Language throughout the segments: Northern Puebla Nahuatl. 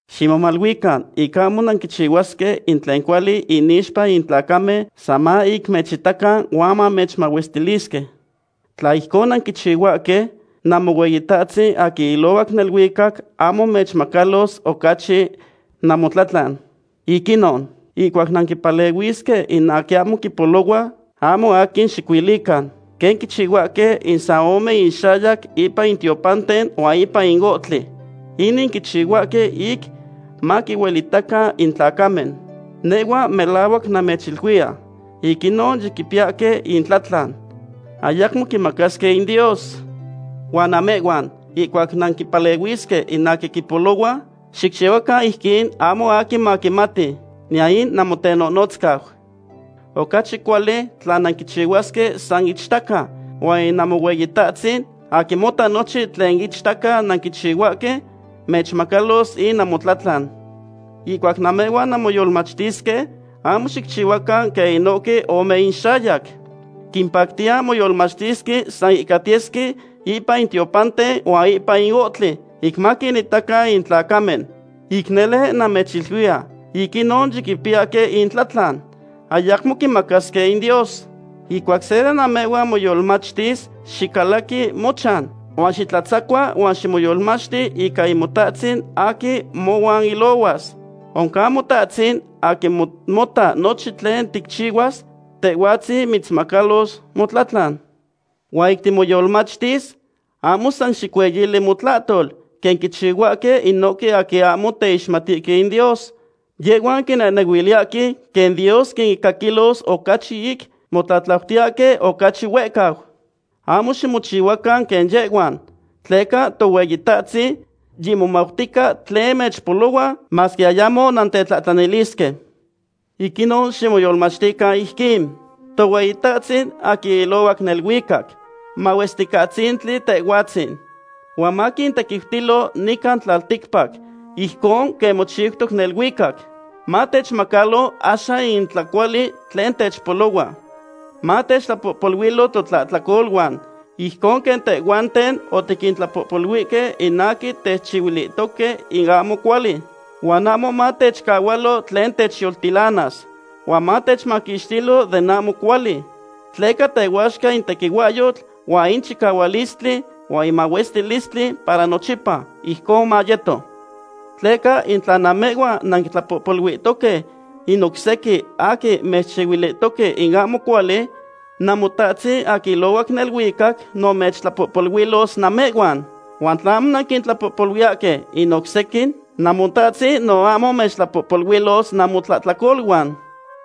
’Ximomaluican ic ahmo nanquichihuasque in tlen cuali inixpa in tlacamen san ma ic mechitacan huan mechmahuestilisque. Tla ijcon nanquichihuahque, Namohueyitahtzin aquin ilohuac neluicac ahmo mechmacalos ocachi namotlatlan. Ic inon, ihcuac nanquimpalehuisque in aquin quimpolohua, ahmo aquin xiquiluican, quen quichihuahque in san ome inxayac ipan in tiopanten huan ipan in ohtli. Inin quichihuahque ic maquinuelitacan in tlacamen. Nehhua melahuac namechiluiya, ic inon yiquipiyahque intlatlan, ayacmo quinmacasque in Dios. Huan namehhuan, ihcuac nanquimpalehuisque in aquin quimpolohua, xicchihuacan ijquin ahmo aquin maquimati, niyan in namotenonotzcau. Ocachi cuali tla nanquichihuasque san ichtaca, huan in Namohueyitahtzin, aquin mota nochin tlen ichtaca nanquichihuahque, mechmacalos in namotlatlan. ’Ihcuac namehhuan nanmoyolmachtisque, ahmo xicchihuacan quen inohque ome inxayac, quimpactiya moyolmachtisque san ihcatiyesque ipan in tiopanten huan ipan in ohtli, ic maquinitacan in tlacamen. Ic nele namechiluiya, ic inon yiquipiyahque intlatlan. Ayacmo quinmacasque in Dios. Ihcuac se de namehhuan moyolmachtis, xicalaqui mochan, huan xitlatzacua huan ximoyolmachti ica in Motahtzin aquin mohuan ilohuas. Oncan Motahtzin, aquin mota nochin tlen ticchihuas, Tehhuatzin mitzmacalos motlatlan. ’Huan ic timoyolmachtis, ahmo san xicueyili motlahtol, quen quichihuahque inohque aquin ahmo teixmatihque in Dios. Yehhuan quinehnehuiliyahque quen Dios quincaquilos ocachi ic motlatlautiyahque ocachi huehcau. Ahmo ximochihuacan quen yehhuan, tleca Tohueyitahtzin yimomautica tlen mechpolohua, masque ayamo nantetlahtlanilisque. Ic inon ximoyolmachtican ijquin: Tohueyitahtzin aquin ilohuac neluicac, mahuesticatzintli Tehhuatzin. Huan maquintequiutilo nican tlalticpac, ijcon quen mochiutoc neluicac. Matechmacalo axan in tlacuali tlen techpolohua. Matechtlapohpoluilo totlahtlacoluan, ijcon quen tehhuanten otiquintlapohpoluihque in aquin techchihuilihtoque in ahmo cuali. Huan ahmo matechcahualo tlen techyoltilanas, huan matechmaquixtilo den ahmo cuali. Tleca tehuaxca in tequihuahyotl, huan in chicahualistli, huan in mahuestilistli para nochipa. Ijcon mayeto. ’Tleca in tla namehhuan nanquintlapohpoluihtoque in oc sequin aquin mechchihuilihtoque in ahmo cuali, Namotahtzin aquin ilohuac neluicac no mechtlapohpoluilos namehhuan. Huan tla ahmo nanquintlapohpoluiyahque in oc sequin, Namotahtzin no ahmo mechtlapohpoluilos namotlahtlacoluan.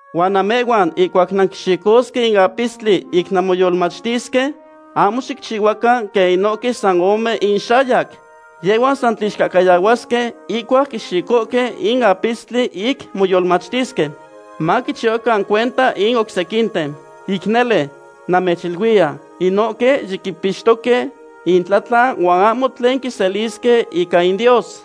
’Huan namehhuan ihcuac nanquixicosque in apistli ic nanmoyolmachtisque, ahmo xicchihuacan quen inohque san ome inxayac. Yehhuan san tlixcahcayahuasque ihcuac quixicohque in apistli ic moyolmachtisque, maquichihuacan cuenta in oc sequinten. Ic nele, namechiluiya, inohque yiquipixtoque intlatlan huan ahmo tlen quiselisque ica in Dios.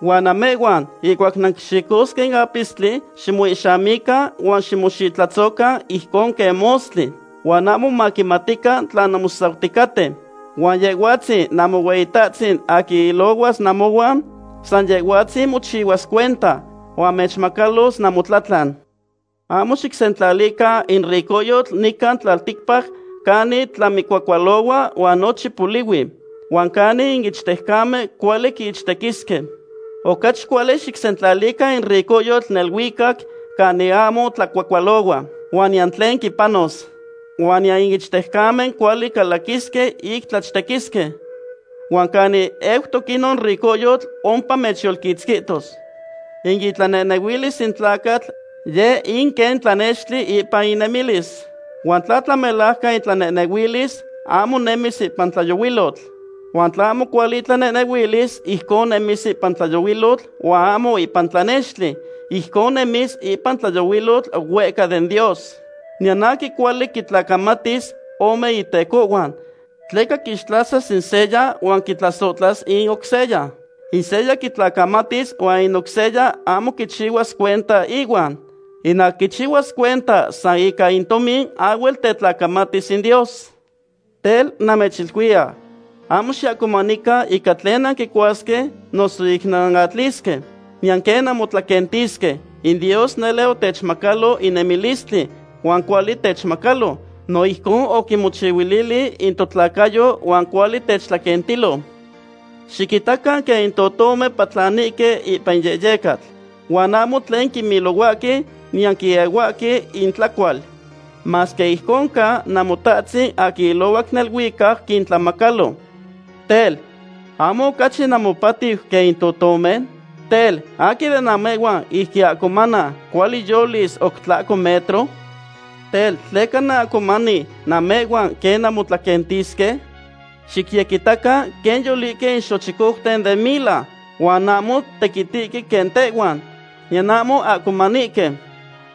Huan namehhuan ihcuac nanquixicosque in apistli, ximoihxamican huan ximoxitlatzocan ijcon quen mostli, huan ahmo maquimatican tla nanmosauticaten. Huan Yehhuatzin Namohueyitatzin aquin ilohuas namohuan, san Yehhuatzin mochihuas cuenta, huan mechmacalos namotlatlan. ’Ahmo xicsentlalican in ricohyotl nican tlalticpac canin tlamicuacualohua huan nochin polihui, huan canin in ichtejcamen cuali quiichtequisque. Ocachi cuali xicsentlalican in ricohyotl neluicac canin ahmo tlacuacualohua, huan niyan tlen quipanos. Huan niyan in ichtejcamen cuali calaquisque ic tlachtequisque. Huan canin eutoc inon ricohyo, ompa mechyolquitzquihtos. ’In itlanehnehuilis in tlacatl, yeh in quen tlanextli ipan inemilis. Huan tla tlamelajcan itlanehnehuilis, ahmo nemis ipan in tlayohuilotl. Huan tla ahmo cuali itlanehnehuilis, ijcon nemis ipan in tlayohuilotl huan ahmo ipan tlanextli. Ijcon nemis ipan in tlayohuilotl huehca den Dios. ’Niyan aquin cuali quitlacamatis ome itecohhuan. Tleca quixtlasas in seya huan quitlasohtlas in oc seya. In seya quitlacamatis huan in oc seya ahmo quichihuas cuenta ihuan. In aquin quichihuas cuenta san ica in tomin ahhuel tetlacamatis in Dios. ’Tel, namechiluiya, ahmo xiahcomanican ica tlen nantlacuasque noso ic nanatlisque, niyan quen nanmotlaquentisque. In Dios nele otechmacalo in nemilistli, huan cuali techtlamacalo. No ijcon oquimochihuilili in totlacayo huan cuali techtlaquentilo. Xiquitacan quen in totomen patlanihque ipan in yehyecatl. Huan ahmo tlen quimilohuahque, niyan quiehuahque intlacual. Masque ijcon ca, Namotahtzin aquin ilohuac neluicac quintlamacalo. Tel, ¿ahmo ocachi namopatiu quen in totomen? Tel, ¿aquin de namehhuan, ic quiahcomana, cuali yolis oc tlahco metro? ’Tel, ¿tleca nanahcomani namehhuan quen nanmotlaquentisque? Xicyequitacan quen yolihque in xochicouten den mila, huan ahmo tequitihque quen tehhuan, niyan ahmo quiahcomanihque.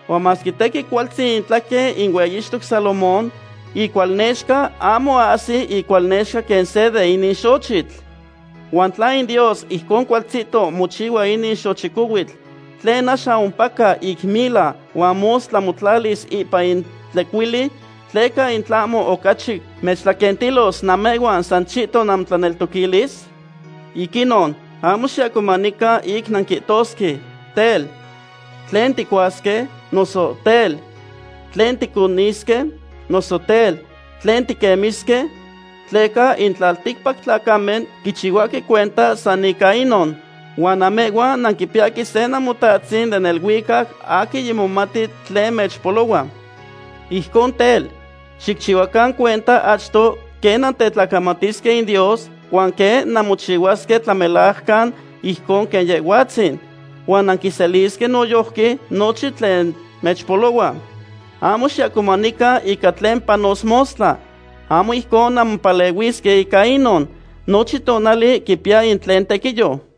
Huan masque tequin cualtzin itlaquen in hueyixtoc Salomón, icualnexca ahmo ahsi icualnexca quen se de inin xochitl. ¿Huan tla in Dios ijcon cualtzihto mochihua inon xochicohuitl, tlen axan ompaca ic mila huan mostla motlatis ipan in tlecuili, tleca in tlahmo ocachi mechtlaquentilos namehhuan san chihton namotlaneltoquilis? Ic inon, ahmo xiahcomanican ic nanquihtosque: “Tel, ¿tlen ticuasque? noso tel, ¿tlen ticonisque? noso tel, ¿tlen tiquemisque?” Tleca in tlalticpac tlacamen quichihuahque cuenta san ica inon. Huan namehhuan nanquipiyahque se Namotatzin den neluicac aquin yimomati tlen mechpolohua. Ijcon tel, xicchihuacan cuenta achto quen nantetlacamatisque in Dios huan quen nanmochihuasque tlamelajcan ijcon quen Yehhuatzin, huan nanquiselisque noyojqui nochin tlen mechpolohua. Ahmo xiahcomanican ica tlen panos mostla. Ahmo ijcon nanmopalehuisque ica inon. Nochin tonali quipiya in tlen tequiyo.